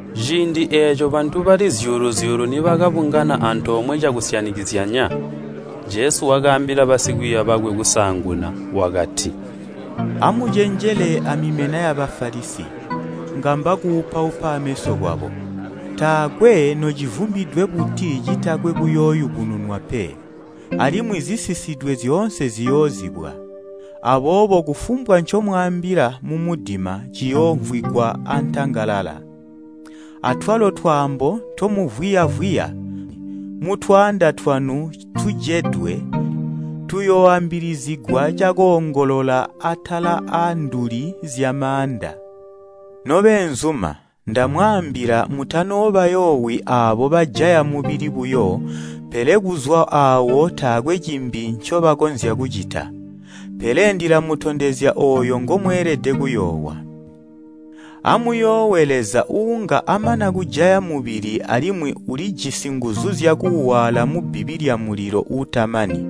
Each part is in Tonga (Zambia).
Ciindi eeco bantu bali zyuulu-zyuulu nibakabungana antoomwe cakusyanikizyanya, Jesu wakaambila basikwiiya bakwe kusaanguna, wakati, “Amucenjele amimena ya Bafalisi, ngamba kupaupa ameso kwabo. Taakwe nocivumbidwe buti citakwe kuyooyubununwa pe, alimwi zisisidwe zyoonse ziyoozibwa. Aboobo kufumbwa ncomwaambila mumudima ciyoomvwigwa aantangalala, atwalo twaambo ntomuvwiya-vwiya mutwanda twanu tujedwe, tuyooambilizigwa cakoongolola atala aanduli zyamaaanda. “Nobeenzuma, ndamwaambila mutanoobayoowi aabo bajaya mubili buyo pele kuzwa aawo taakwe cimbi ncobakonzya kucita. Pele ndilamutondezya ooyo ngomweelede kuyoowa. Amuyoowe Leza uunga amana kujaya mubili alimwi ulijisi nguzu zyakuuwaala mubbibi lyamulilo uutamani.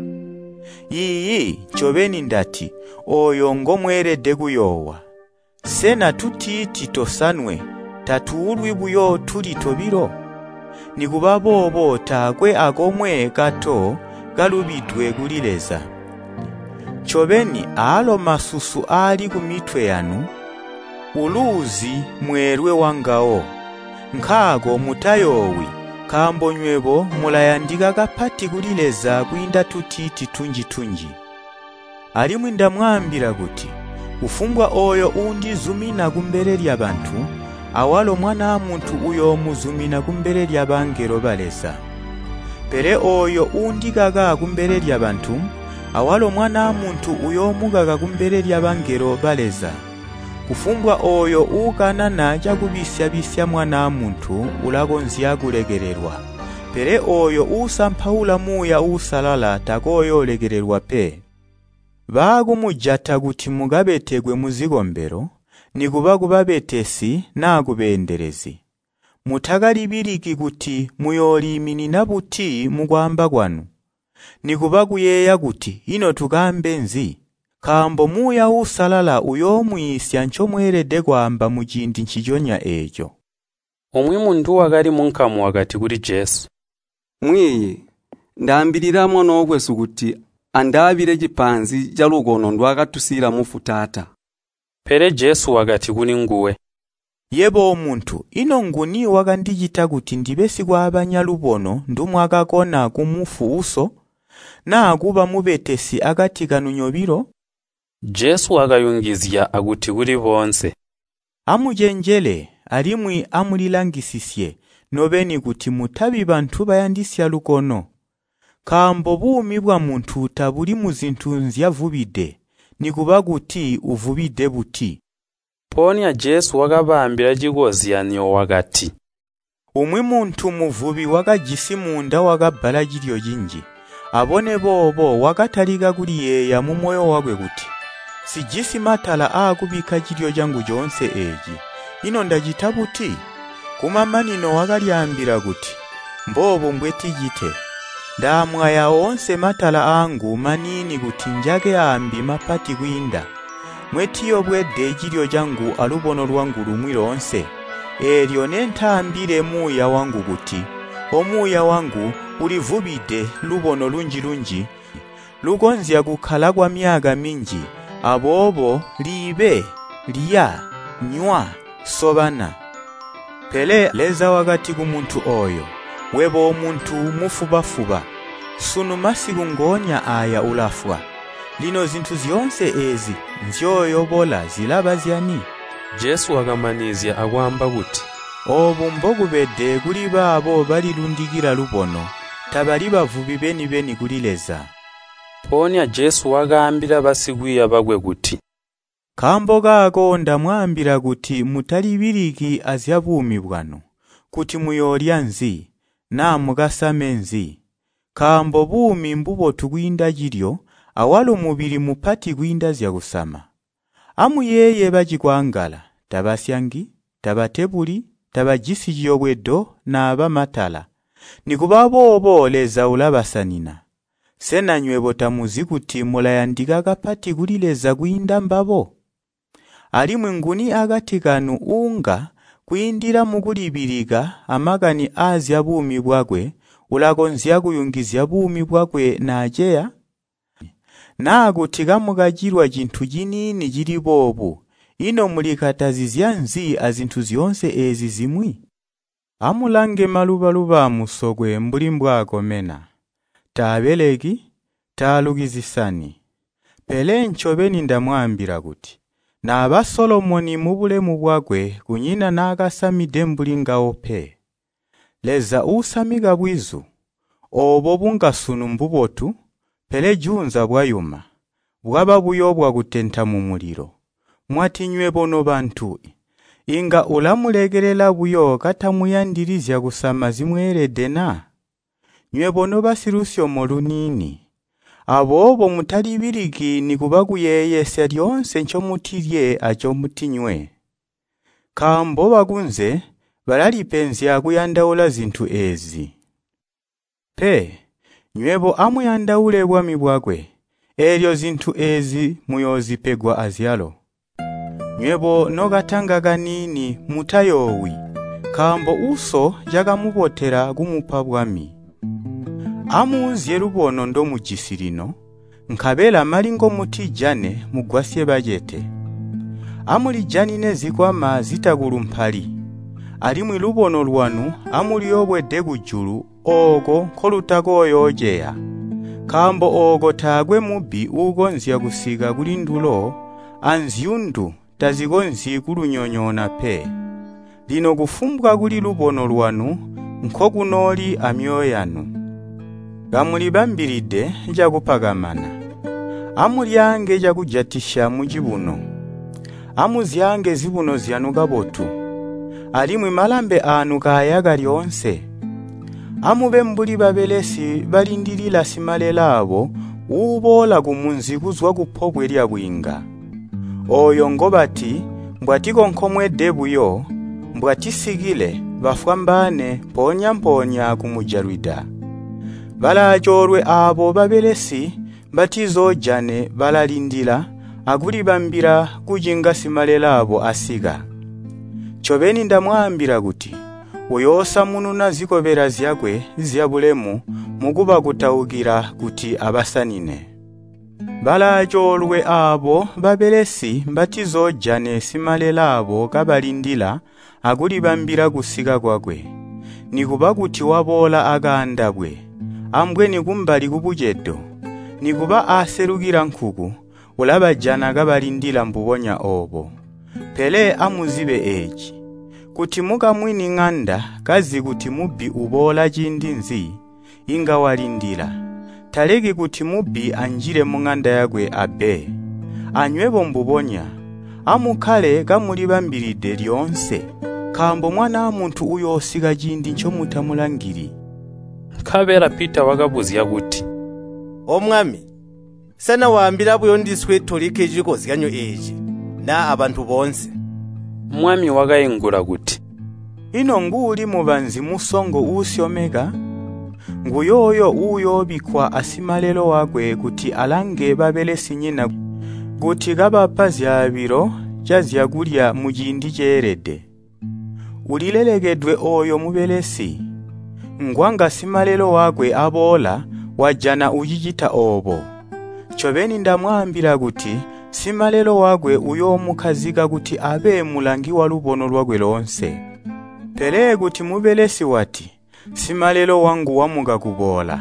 Iiyi, ncobeni ndati, ooyo ngomweeelede kuyoowa! “Sena tutiiti tosanwe tatuulwi buyo tuli tobilo? Nikubaboobo taakwe akomwe kato kalubidwe kuli Leza. Ncobeni, aalo masusu aali kumitwe yanu uluuzi mweelwe wangawo. Nkaako mutayoowi, nkaambo nywebo mulayandika kapati kuli Leza kwiinda tutiiti tunji-tunji! “Alimwi ndamwaambila kuti, kufumbwa ooyo uundizumina kumbele lyabantu, awalo Mwanaa Muntu uyoomuzimina kumbele lyabangelo ba Leza. Pele ooyo uundikaka kumbele lyabantu, awalo Mwanaa Muntu uyoomukaka kumbele lyabangelo ba Leza. “Kufumbwa ooyo uukanana cakubisya-bisya Mwanaa Muntu ulakonzya kulekelelwa, pele ooyo uusampaula Muuya Uusalala takooyoolekelwa pe. “Baakumujata kuti mukabetekwe muzikombelo, nikuba kubabetesi naa kubeendelezi, mutakalibiliki kuti muyooliiminina buti mukwaamba kwanu, nikuba kuyeeya kuti, ‘Ino tukaambe nzi?’ Nkaambo Muuya Uusalala uyoomwiisya ncomweelede kwaamba muciindi nciconya eeco.” Umwi muntu wakali munkamu wakati kuli Jesu, “Mwiiyi, ndaambilila mwanookwesu kuti andaabile cipaanzi calubono ndwaakatusiila mufu taata.” Pele Jesu wakati kulinguwe, “Yebo omuntu, ino nguni wakandicita kuti ndibe sikwaabanya lubono ndumwakakona kumufu uso, naa kuba mubetesi akati kanu nyobilo?” Jesu wakayungizya akuti kuli boonse, “Amucenjele, alimwi amulilangisisye nobeni kuti mutabi bantu bayandisya lubono, nkaambo buumi bwamuntu tabuli muzintu zyavubide, nikuba kuti uvubide buti.” Mpoonya Jesu wakabaambila cikozyanyo wakati, “Umwi muntu muvubi wakajisi muunda wakabbala cilyo cinji. Abone boobo wakatalika kuliyeeya mumoyo wakwe wati, ‘Nsijisi matala aakubikka cilyo cangu coonse eeci. Ino ndacita buti?’ Kumamanino wakalyaambila kuti, ‘Mboobu mbweticite. Ndaamwaya oonse matala aangu maniini kuti njake aambi mapati kwiinda, mwetiyobwede cilyo cangu alubono lwangu lumwi loonse. Eelyo nentaambile muuya wangu kuti, O muuya wangu! Ulivubide lubono lunji-lunji lukonzya kukkala kwamyaka minji, aboobo liibe, lya, nywa, sobana.’ Pele Leza wakati kumuntu ooyo, ‘Webo omuntu mufuba-fuba! Sunu masiku ngoonya aaya ulafwa. Lino zintu zyoonse eezi nzyooyobola zilaba zyani?’” Jesu wakamanizya akwaamba kuti, “Oobu mbokubede kulibaabo balilundikila lubono. Tabali bavubi beni-beni kuli Leza.” Mpoonya Jesu wakaambila basikwiiya bakwe kuti, “Nkaambo kaako ndamwaambila kuti mutalibiliki azyabuumi bwanu, kuti muyoolya nzi, naa mukasame nzi. Nkaambo buumi mbubotu kwiinda cilyo awalo mubili mupati kwiinda zyakusama. Amuyeeye bacikwangala, tabasyangi, tabatebuli, tabajisi ciyobwedo naaba matala. Nikuba boobo Leza ulabasanina. Sena nywebo tamuzi kuti mulayandika kapati kuli Leza kwiinda mbabo? Alimwi, nguni akati kanu uunga, kwiindila mukulibilika amakani aazyabuumi bwakwe, ulakonzya kuyungizya buumi bwakwe naaceya? Naa kuti kamukacilwa cintu ciniini cili boobu, ino mulikatazizya nzi azintu zyoonse eezi zimwi? “Amulange muluba-luba aamusokwe mbuli mbwaakomena, taabeleki, taaluki zisani. Pele ncobeni ndamwaambila kuti, naba Solomoni, mubulemu bwakwe kunyina naakasamide mbuli ngawo pe. Leza uusamika bwizu, oobo bunga sunu mbubotu, pele juunza bwayuma, bwaba buyo bwakutenta mumulilo, mwati nywebo nobantu, inga ulamulekelela buyo katamuyandili zyakusama zimweelede na? Nywebo nobasilusyomo luniini! “Aboobo mutalibiliki nikuba kuyeeyesya lyoonse ncomutilye ancomutinywe. Nkaambo bakunze balalipenzya kuyandaula zintu eezi. Pe, nywebo amuyandaule bwami bwakwe, eelyo zintu eezi muyoozipegwa azyalo. “Nywebo nokatanga kaniini mutayoowi, nkaambo Uso cakamubotela kumupa bwami. Amuuzye lubono ndomujisi lino, nkabela mali ngomutijane mugwasye bacete. Amulijanine zikwama zitakulumpali, alimwi lubono lwanu amuluyobwede kujulu ooko nkolutakooyooceya, nkaambo ooko taakwe mubbi uukonzya kusika kulindulo anzyundu tazikonzyi kulunyonyoona pe. Lino kufumbwa kuli lubono lwanu nkokunooli mizeezo yanu. “Kamulibambide cakupakamana. Amulyaange cakujatisya mucibuno, amuzyaange zibuno zyanu kabotu, alimwi malambe aanu kaayaka lyoonse. Amube mbuli babelesi balindilila simalelaabo uuboola kumunzi kuzwa kupobwe lyabwiinga. Ooyo ngobati mbwatikonkomwede buyo, mbwatisikile, bafwambaane mpoonya-mpoonya kumujalwida. Balaacoolwe aabo babelesi mbatizoojane balalindila akulibambila kucinga simalelaabo asika! Ncobeni ndamwaambila kuti uyoosamununa zikobela zyakwe zyabulemu mukubakutaukila kuti abasanine. Balaacoolwe aabo babelesi mbatizoojane simalelaabo kabalindila akulibambila kusika kwakwe, nikuba kuti waboola akaandabwe, ambweni kumbali kubucedo, nikuba aaselukila nkuku, ulabajana kabalindila mbubonya oobo! Pele amuzibe eeci! Kuti mukamwini ŋanda kazi kuti mubbi uboola ciindi nzi, inga walindila, taleki kuti mubbi anjile muŋanda yakwe abbe. Anywebo mbubonya, amukkale kamulibambilide lyoonse, nkaambo Mwanaa Muntu uyoosika ciindi ncomutamulangili.” Nkabela Pita wakabuzya kuti, “Omwami, sena waambila buyo ndiswe tolikke cikozyanyo eeci, naa abantu boonse?” Mwami wakaingula kuti, “Ino nguuli mubanzi musongo uusyomeka? Nguyooyo uyoobikkwa asimalelo wakwe kuti alange babelesinyina kuti kabapa zyaabilo cazyakulya muciindi ceelede. Ulilelekedwe ooyo mubelesi, ngwanga simalelo wakwe aboola, wajana ucicita oobo! Ncobeni ndamwaambila kuti simalelo wakwe uyoomukkazika kuti abe mulangi walubono lwakwe loonse. Pele kuti mubelesi wati, ‘Simalelo wangu wamuka kuboola,’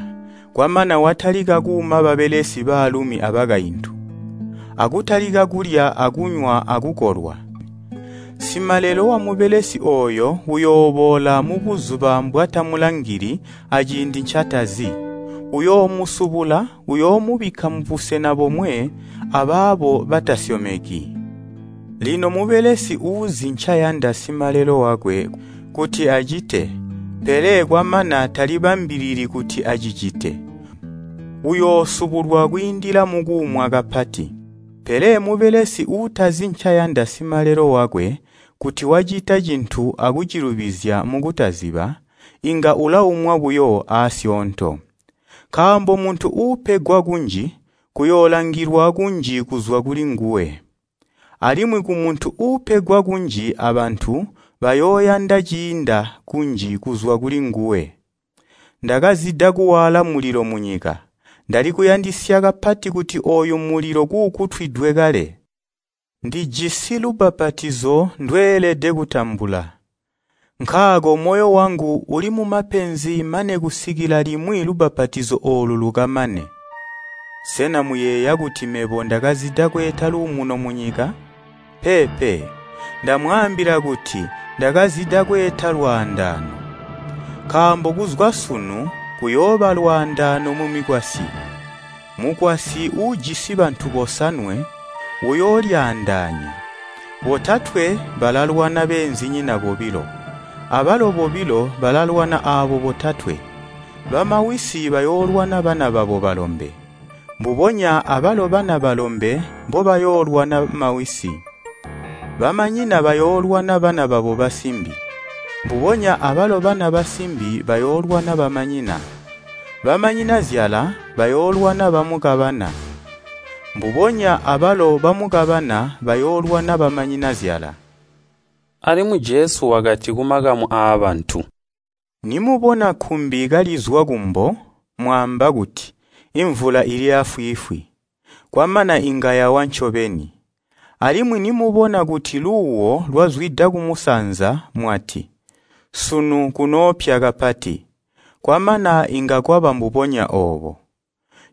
kwamana watalika kuuma babelesi baalumi abakaintu, akutalika kulya akunywa akukolwa, simalelo wamubelesi ooyo uyooboola mubuzuba mbwatamulangili aciindi ncatazi. Uyoomusubula uyoomubikka mubusena bomwe abaabo batasyomeki. Lino mubelesi uuzi ncayanda simalelo wakwe kuti acite, pele kwamana talibambilili kuti acicite, uyoosubulwa kwiindila mukuumwa kapati. Pele mubelesi uutazi ncayanda simalelo wakwe, kuti wacita cintu akucilubizya mukutaziba, inga ulaumwa buyo aasyoonto. Nkaambo muntu uupegwa kunji, kuyoolangilwa kunji kuzwa kulinguwe, alimwi kumuntu uupegwa kunji abantu bayooyanda ciinda kunji kuzwa kulinguwe. “Ndakazida kuwaala mulilo munyika. Ndali kuyandisya kapati kuti ooyu mulilo kuukutwidwe kale! Ndijisi lubbapatizo ndweelede kutambula. Nkaako moyo wangu uli mumapenzi mane kusikila limwi lubbapatizo oolu lukamane! Sena muyeeya kuti mebo ndakazida kweeta luumuno munyika? Peepe, ndamwaambila kuti ndakazida kweeta lwaandaano. Nkaambo kuzwa sunu kuyooba lwaandaano mumikwasyi, mukwasyi uujisi bantu bosanwe uyoolyaandaanya, botatwe balalwana beenzinyina bobilo, abalo bobilo balalwana aabo botatwe. Bamawisi bayoolwana bana babo balombe, mbubonya abalo bana balombe mbobayoolwana mawisi. Bamanyina bayoolwana bana babo basimbi, mbubonya abalo bana basimbi bayoolwana bamanyina. Bamanyinazyala bayoolwana bamukabana, mbubonya abalo bamukabana bayoolwana bamanyinazyala.” Alimwi Jesu wakati kumakamu aabantu, “Nimubona kkumbi kalizwa kumbo, mwaamba kuti, ‘Imvula ili aafwiifwi,’ kwamana inga yawa ncobeni. Alimwi nimubona kuti luuwo lwazwida kumusanza mwalati, ‘Sunu kunoopya kapati,’ kwamana inga kwaba mbubonya oobo.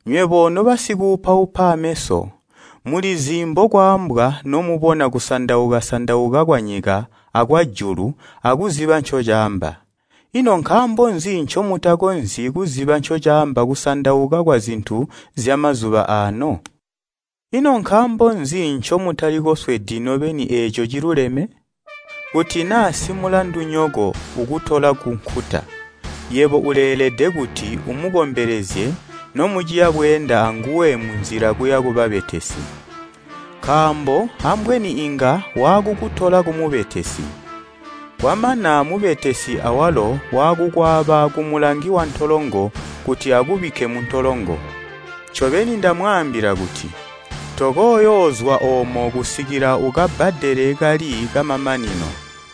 Nywebo nobasikuupaupa ameso mulizi mbokwaambwa nomubona kusandauka-sandauka kwanyika akwajulu akuziba ncocaamba, ino nkaambo nzi ncomutakonzyi kuziba ncocaamba kusandauka kwazintu zyamazuba aano? “Ino nkaambo nzi ncomutali koswedi nobeni eeco ciluleme? Kuti naa simulandunyoko ukutola kunkuta, yebo uleelede kuti umukombelezye nomuciya bweenda anguwe munzila kuya kubabetesi. Nkaambo ambweni inga waakukutola kumubetesi, kwamana mubetesi awalo waakukwaaba kumulangi wantolongo kuti akubikke muntolongo. Ncobeni, ndamwaambila kuti tokooyoozwa oomo kusikila ukabbadele kali kamamanino.”